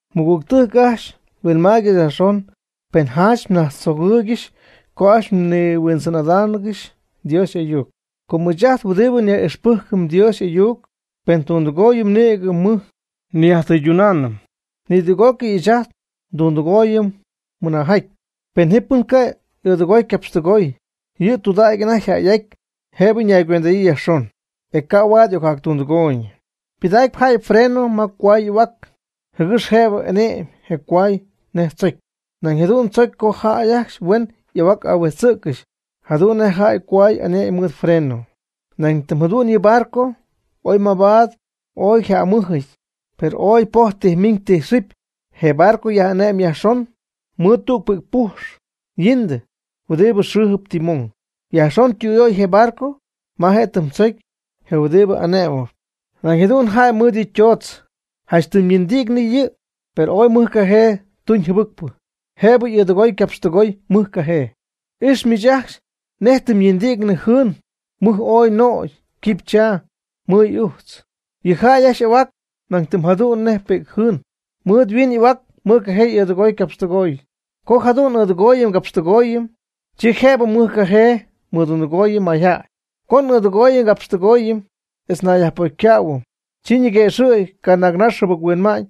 Mɨgügtɨjc ajcxy, huinmaygɨx yajxon pen janch mnajtztzogɨɨygɨxy co ajcxy mnihuindzɨn'adaangɨxy Dios y'ayuc. Com ɨɨch ajt huɨdibɨ nyaj'ixpɨjcɨm Dios y'ayuc, pen tundɨgooyɨm nïgɨ mɨj nyajtɨydunaanɨm. Nidüg'ócɨy ɨɨch ajt ndundɨgooyɨm mɨnaajɨty. Pen ji pɨn ca' y'ɨɨdɨgooy ycapxtɨgooy, yɨ' tɨydudägy anajty yjäy'aty, jëbɨ ñaygüend'adyii yajxon, e ca' huaad y'ocjactundɨgooyñɨ. Ypɨdacpy jäy freno ma cohuay y'ahuac jɨgɨx jëbɨ ane'my je cohuay nej tzocy. Nañ jadu'n tzocy co jäy ajcxy huen y'ahuac ahuijtzcɨxy jadu'n nej jäy cohuay ane'my mɨɨd freno. Nañ jadu'n yɨ barco oy mabaad ooy yjamɨjɨty, per ooy poj ytijminyii ytijxɨbyii. Je barco yaj'ane'm yajxon mɨɨd tüg pi'c pujx yindi'cnɨ huɨdib xɨɨjɨp timón. Yajxon ytüyöy je barco ma je' tɨmdzocy je huɨdibɨ ane'mɨp. Nañ jadu'n yjaty mɨɨd yɨ tootz, janch tɨm yindi'cnɨ yɨ', per ooy mɨj cajee tuñ jɨbɨcpɨ, jëbɨ y'ɨɨdɨgooy ycapxtɨgooy mɨj cajee. M'ijxyp miich ajcxy nej tɨm yindi'cnɨ jɨɨn mɨj ooy nögy quipychaa mɨy'ujtz. Yɨ jäy ajcxy y'ahuac nañ tɨm jadu'n nej pi'c jɨɨn, mɨɨd nhuin n'ahuac mɨjcajee n'ɨɨdɨgooyɨm ngapxtɨgooyɨm. Co jadu'n n'ɨɨdɨgooyɨm ngapxtɨgooyɨm, chi jëbɨ mɨjcajee mɨdundɨgooyɨm mayjäy. Co n'ɨɨdɨgooyɨm ngapxtɨgooyɨm, etz nayyajpocycähuɨm, chi ñiguëxɨ̈gy canaagnax jɨbɨc-huinma'ñ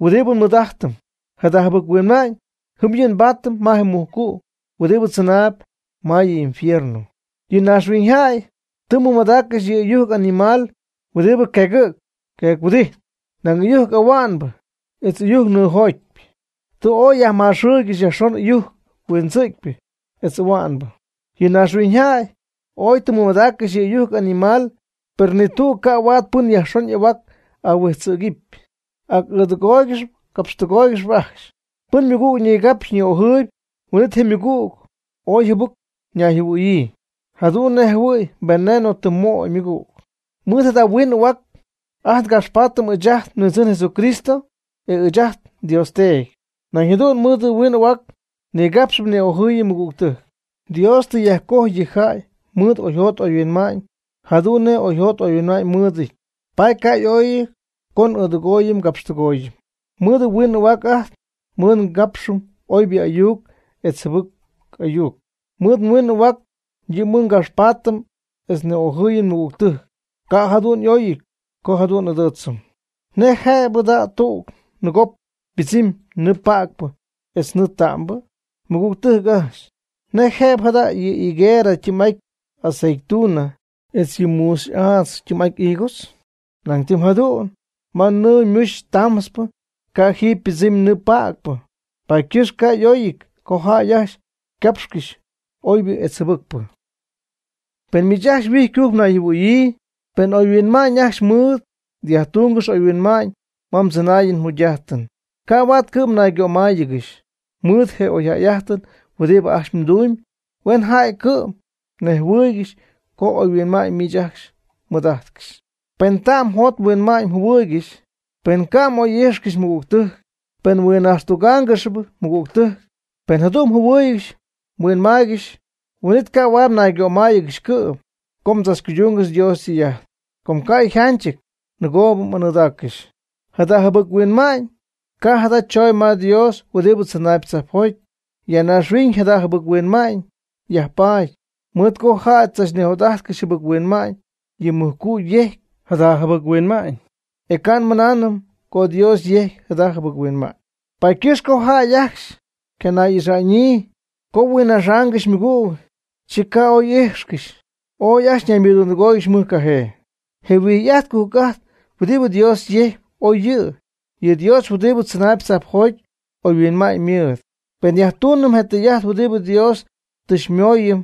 huɨdibɨ nmɨɨd'ajtɨm. Jada jɨbɨc-huinma'ñ jɨm yɨ' nbaatɨm ma je mujcu' huɨdibɨ tzɨnaayb ma yɨ infierno. Yɨ naaxhuiñyjäy tɨ mɨmadaaccɨxy yɨ ɨyujc animal huɨdibɨ queegɨ̈cp queec-huɨdijtp, naag ɨyujc ahua'nbɨ, etz ɨyujc nɨɨjotyp. Tɨ ooy yajmaxɨɨygɨxy yajxon ɨyujc huindzɨ̈cypɨ etz ahuá'nɨbɨ. Yɨ naaxhuiñyjäy oy tɨ mɨmadaaccɨxy yɨ ɨyujc animal, per nitüg ycaca'ty pɨn yajxon y'ahuac ahuijtzɨ̈gɨpy, ac'ɨɨdɨgooygɨxp capxtɨgooygɨxp ajcxy. Pɨn ymɨgüg nigapxy ni'ojɨɨyb, huin'it je ymɨgüg ooy jɨbɨc ñayjɨhuɨ̈hua'ñyii, jadu'n nej jɨhuɨ̈y veneno tɨ möy ymɨgüg. Mɨɨd jada' nhuin n'ahuac ajt ngapxpaatɨm ɨɨch ajt nHuindzɨn Jesucristo etz ɨɨch ajt nDios Teedy. Nañ jadu'n mɨɨd nhuin n'ahuac nigapx ni'ojɨɨyɨm nmɨgügtɨjc. Dios tɨ yajcojy yɨ jäy mɨɨd oyjot oyhuinma'ñ jadu'n nej yɨ' oyjot oyhuinma'ñ mɨɨdɨty, paady ca' y'oyɨty co n'ɨɨdɨgooyɨm ngapxtɨgooyɨm. Mɨɨd nhuiin n'ahuac ajt mɨɨd ngapxɨm oybɨ ayuc etz jɨbɨc ayuc. Mɨɨd nhuin n'ahuac yɨ' mɨɨd ngapxpaatɨm etz ni'ojɨɨyɨm nmɨgügtɨjc. Ca' jadu'n y'oyɨty co jadu'n n'adɨɨtzɨm. ¿Nej jëbɨ jada' ma tüg nɨɨgop ypɨdzɨmy nɨɨ päcpɨ etz nɨɨ ta'mbɨ? Mɨgügtɨjc ajcxy, ¿nej jëbɨ jada' yɨ higuerɨ ytɨɨm'aty aceituna etz yɨ muuxy'aadz ytɨɨm'aty higos? Nañ tɨm jadu'n ma nɨɨ ymuxy tamtzpɨ, ca' jɨm ypɨdzɨmy nɨɨ päcpɨ. Paady ycɨxp ca' y'oyɨty co jäy ajcxy capxcɨxy oybɨ etz jɨbɨcpɨ. Pen miich ajcxy huijycujc mnayjɨhuɨɨyɨ, pen oyhuinma'ñ ajcxy mmɨɨd, yajtungɨx m'oyhuinma'ñ ma mdzɨnaayɨn mjugy'ajtɨn. Ca' huaad cɨ'm ñaygömáayɨgɨxy. Mɨɨd je oyjäy'ajtɨn huɨdibɨ ajcxy mdumyb huen jäy cɨ'm nejhuɨɨygɨxy co oyhuinma'ñ miich ajcxy mɨɨd'ajtcɨxyp. Pen ta'm mjot mhuinma'ñ mjɨhuɨɨygɨxy, pen mga'oy'ijxcɨxyp ymɨgügtɨjc, pen mhuinnaxtugaangɨxyp ymɨgügtɨjc, pen jadu'n mjɨhuɨɨygɨxy mhuinmaaygɨxy, huin'it ca' huaad mnaygömáayɨgɨxy cɨ'm co mdzachcuydungɨxy Dios ytɨy'ajt, com ca' yjanchɨty, nɨgoo m'anɨɨdaaccɨxy. Jada jɨbɨc-huinma'ñ ca' jada chooñ ma Dios huɨdibɨ tzɨnaayb tzajpjoty. Ya naaxhuiñ jada jɨbɨc-huinma'ñ yajpaady, mɨɨd co jäy tzachnijot'ajtcɨxy jɨbɨc-huinma'ñ. Yɨ mujcu' yejcpy jada jɨbɨc huinma'ñ, e ca' nmɨnanɨm co Dios yecy jada jɨbɨc-huinma'ñ. Paady ycɨxp co jäy ajcxy ycanay'ixa'ñyii, co huinnaxaangɨxy ymɨgüg, chi ca' oy y'ijtcɨxy, oy ajcxy ñaymɨdundɨgóoyɨgɨxy mɨjcajee. Je huijy'ajt cujc'ajt huɨdibɨ Dios yejcyp, ooy yɨ'. Yɨ Dios huɨdi tzɨnaayb tzajpjoty oyhuinma'ñ ymɨɨd. Pen nyajtuunɨm je tɨy'ajt huɨdibɨ Dios tɨ xymooyɨm,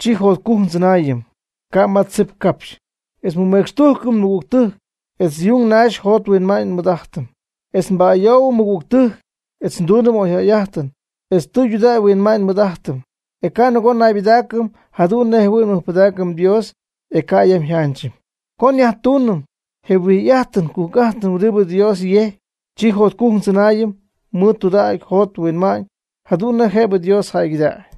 chi jotcujc ndzɨnaayɨm, ca' ma tzip capxy, etz nmɨmecxtujcɨm nmɨgügtɨjc, etz yung naxy jot huinma'ñ nmɨɨd'ajtɨm, etz nba'ayoohuɨm nmɨgügtɨjc, etz nduunɨm oyjäy'ajtɨn, etz tudägy nhuinma'ñ nmɨɨd'ajtɨm. E ca' nɨgoo naybɨdaacɨm jadu'n nej jɨhuïy nmɨjpɨdaacɨm Dios, e ca' yam yjanchɨty. Co nyajtuunɨm je huijy'ajtɨn cujc'ajtɨn huɨdib Dios yejcpy, chi jotcujc ndzɨnaayɨm mɨɨd tudägy njot nhuinma'ñ, jadu'n nej jëb Dios jäygɨdägy.